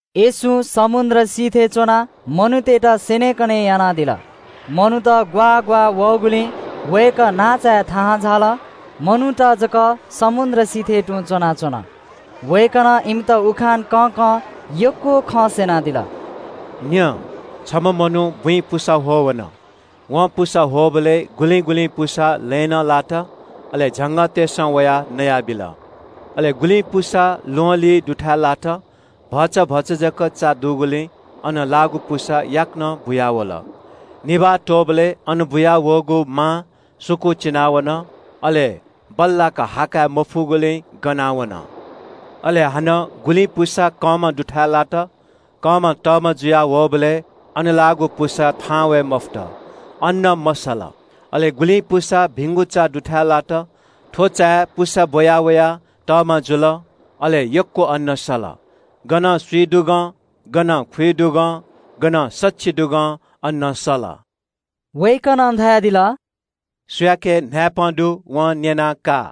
येशूं समुद्र सिथय् च्‍वनाः मनूतय्‌त स्‍यनेकने यानादिल। मनूत ग्‍वाः ग्‍वाः वःगुलिं वय्‌कः नांचाय् थाहां झाल, मनूत जक समुद्र सिथय् तुं च्‍वनाच्‍वन। वय्‌कलं इमित उखान कँकं यक्‍व खँ स्‍यनादिल – “न्‍यँ, छम्‍ह मनू बुँइ पुसा ह्वः वन। वं पुसा ह्वःबलय् गुलिं गुलिं पुसा लँय् नं लात, अले झंगःतय्‌सं वयाः नयाबिल। अले गुलिं पुसा ल्‍वहंलिं दुथाय् लात। भचा भचा जक चा दुगुलिं अन लाःगु पुसा याकनं बुयावल। निभाः त्‍वःबलय् अन बुयावःगु मा सुकूचिना वन, अले बल्‍लाक हा काय् मफुगुलिं गना वन। अले हानं गुलिं पुसा कंमा दुथाय् लात। कंमा तःमा जुया वःबलय् अन लाःगु पुसा थाहां वये मफुत, अन्‍न मसल। अले गुलिं पुसा भिंगु चा दुथाय् लात। थ्‍व चाय् पुसा बुया वयाः तःमा जुल। अले यक्‍व अन्‍न सल। गनं स्‍विदुगं, गनं खुइदुगं, गनं सछिदुगं अन्‍न सल।” वय्‌कलं धयादिल – “सुयाके न्‍हाय्‌पं दु, वं न्‍यना का।”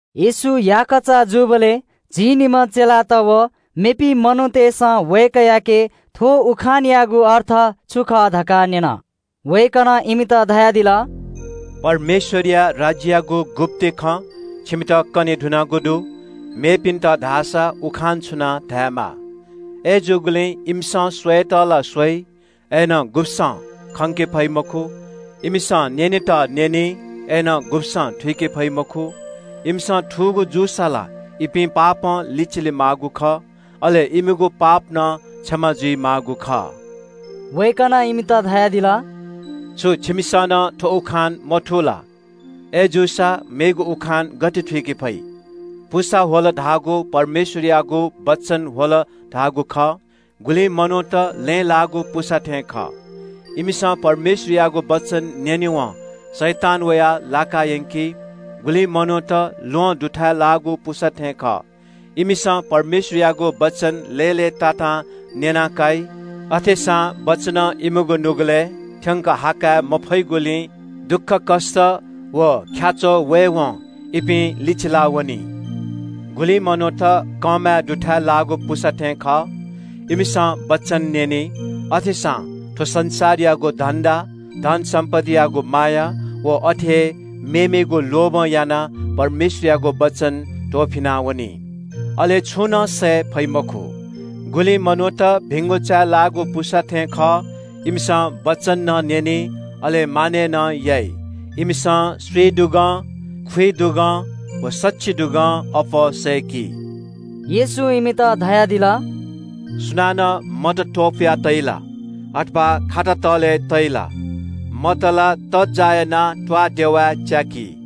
येशू याकःचा जूबलय् झिंनिम्‍ह चेलात व मेपिं मनूतय्‌सं वय्‌कःयाके थ्‍व उखानयागु अर्थ छु खः धकाः न्‍यन। वय्‌कलं इमित धयादिल – “परमेश्‍वरया राज्‍ययागु गुप्‍ति खँ छिमित कने धुनागु दु, मेपिन्‍त धाःसा उखान छुनाः धायेमाः। “‘अय्‌जूगुलिं इमिसं स्‍वयेत ला स्‍वइ, अय्‌नं गुब्‍सं खंके फइ मखु। इमिसं न्‍यनेत न्‍यनी, अय्‌नं गुब्‍सं थुइके फइ मखु। इमिसं थूगु जूसा ला इपिं पापं लिचिले माःगु खः, अले इमिगु पाप नं क्षमा जुइमाःगु खः।’” वय्‌कलं इमित धयादिल – “छु छिमिसं नं थ्‍व उखान मथू ला? अय्‌जूसा मेगु उखान गथे थुइके फइ? पुसा ह्वल धाःगु परमेश्‍वरयागु वचन ह्वल धाःगु खः। गुलिं मनूत लँय् लाःगु पुसा थें खः। इमिसं परमेश्‍वरयागु वचन न्‍यनेवं शैतान वयाः लाकायंकी। गुलिं मनूत ल्‍वहं दुथाय् लाःगु पुसा थें खः। इमिसं परमेश्‍वरयागु वचन लय्‌लय्‌तातां न्‍यना काइ। अथेसां वचनं इमिगु नुगलय् थ्‍यंक हा काय् मफइगुलिं दुःखकष्‍ट व ख्‍याच्‍वः वयेवं इपिं लिचिला वनी। गुलिं मनूत कंमा दुथाय् लाःगु पुसा थें खः। इमिसं वचन न्‍यनी। अथेसां थ्‍व संसारयागु धन्‍दा, धन सम्‍पत्तियागु माया व अथे हे मेमेगु लोभं यानाः परमेश्‍वरयागु वचन त्‍वःफिना वनी, अले छंु नं सय्‌के फइ मखु। गुलिं मनूत भिंगु चाय् लाःगु पुसा थें खः। इमिसं वचन नं न्‍यनी, अले मानय् नं याइ। इमिसं स्‍विदुगं, खुइदुगं, व सछिदुगं अप्‍वः अन्‍न सय्‌की।” येशूं इमित धयादिल – “सुनानं मत त्‍वपुया तइ ला? अथवा खाता तःले तइ ला? मत ला तज्‍जाः यानाः त्‍वाःदेवाय् च्‍याकी।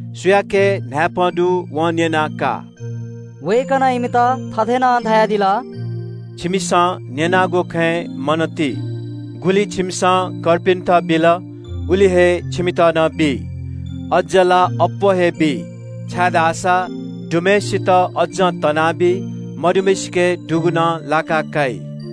सुयाके न्‍हाय्‌पं दु, वं न्‍यना का।” वय्‌कलं इमित थथे नं धयादिल – “छिमिसं न्‍यनागु खँय् मन ति। गुलि छिमिसं कर्पिन्‍त बिल, उलि हे छिमित नं बी। अज्‍ज ला अप्‍वः हे बी, छाय्‌धाःसा दुम्‍हय्‌सित अज्‍जं तनाबी। मदुम्‍हय्‌सिके दुगु नं लाका काइ।”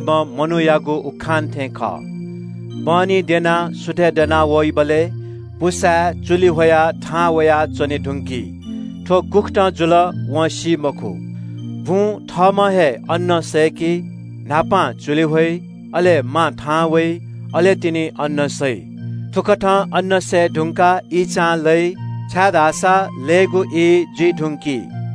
व चान्‍हि द्यंसां दंसां पुसाय् चुलि ह्वयाः थाहां वयाच्‍वने धुंकी। थ्‍व गुकथं जुल वं सी मखु। बुँ थःम्‍हं हे अन्‍न सय्‌की। न्‍हापां चुलि ह्वइ, अले मा थाहां वइ, अले तिनि अन्‍न सइ। थुकथं अन्‍न सये धुंकाः ईंचां लइ, छाय्‌धाःसा लयेगु ई जुइ धुंकी।”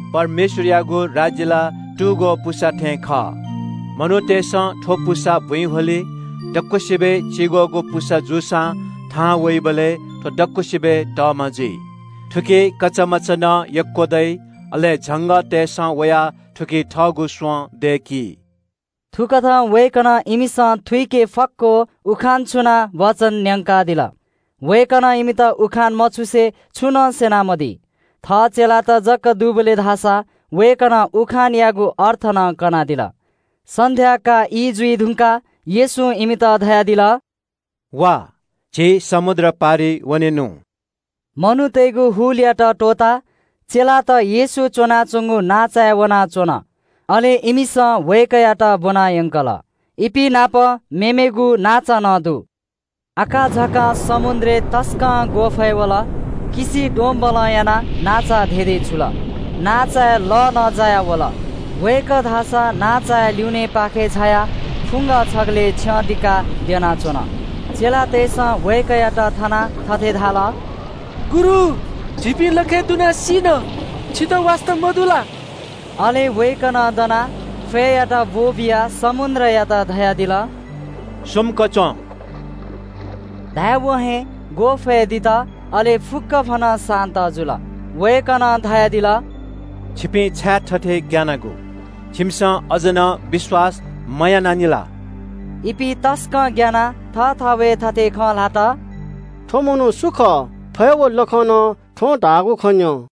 परमेश्‍वरयागु राज्‍य ला दक्‍वसिबय् चिग्‍वःगु पुसा थें खः। छम्‍ह मनुखं तू पुसा बुँइ ह्वली। दक्‍वसिबय् चिग्‍वःगु पुसा जूसां थाहां वइबलय् थ्‍व दक्‍वसिबय् तःमा जुइ। थुकी कचामचा नं यक्‍व दइ, अले झंगःतय्‌सं वयाः थुकी थःगु स्‍वँ दय्‌की।” थुकथं वय्‌कलं इमिसं थुइके फक्‍व उखान छुनाः वचन न्‍यंकादिल। वय्‌कलं इमित उखान मछुसे छुं नं स्‍यनामदी। थः चेलात जक दुबलय् धाःसा वय्‌कलं उखानयागु अर्थ नं कनादिल। सन्‍ध्‍याकाः ई जुइ धुंकाः येशूं इमित धयादिल – “वा, झी समुद्र पारिइ वनेनु।” मनूतय्‌गु हुलयात त्‍वःताः चेलात येशू च्‍वनाच्‍वंगु नांचाय् वनाः च्‍वन। अले इमिसं वय्‌कःयात ब्‍वनायंकल। इपिं नाप मेमेगु नांचा नं दु। आकाझाकां समुद्रय् तसकं ग्‍वःफय् वल। लः ग्‍वारां यानाः नांचा धेधेचुल। नांचाय् लः नं जायावल। वय्‌कः धाःसा नांचाया ल्‍युनेपाखे झायाः फुंग छगलय् छ्यं दिकाः द्यनाच्‍वन। चेलातय्‌सं वय्‌कःयात थनाः थथे धाल – “गुरु, झीपिं लखय् दुनाः सीन, छितः वास्‍ता मदु ला?” अले वय्‌कलं दनाः फय्‌यात ब्‍वःबियाः समुद्रयात धयादिल – “शान्‍त जु।” धाय्‌वं हे ग्‍वःफय् दित, अले फुक्‍कभनं शान्‍त जुल। वय्‌कलं धयादिल – “छिपिं छाय् थथे ग्‍यानागु? छिमिसं अज्‍ज नं विश्‍वास मयानानि ला?” इपिं तसकं ग्‍यानाः थःथवय् थथे खँ ल्‍हात – “वय्‌कः सु खः? फय् व लखं नं वय्‌कलं धाःगु खँ न्‍यं।”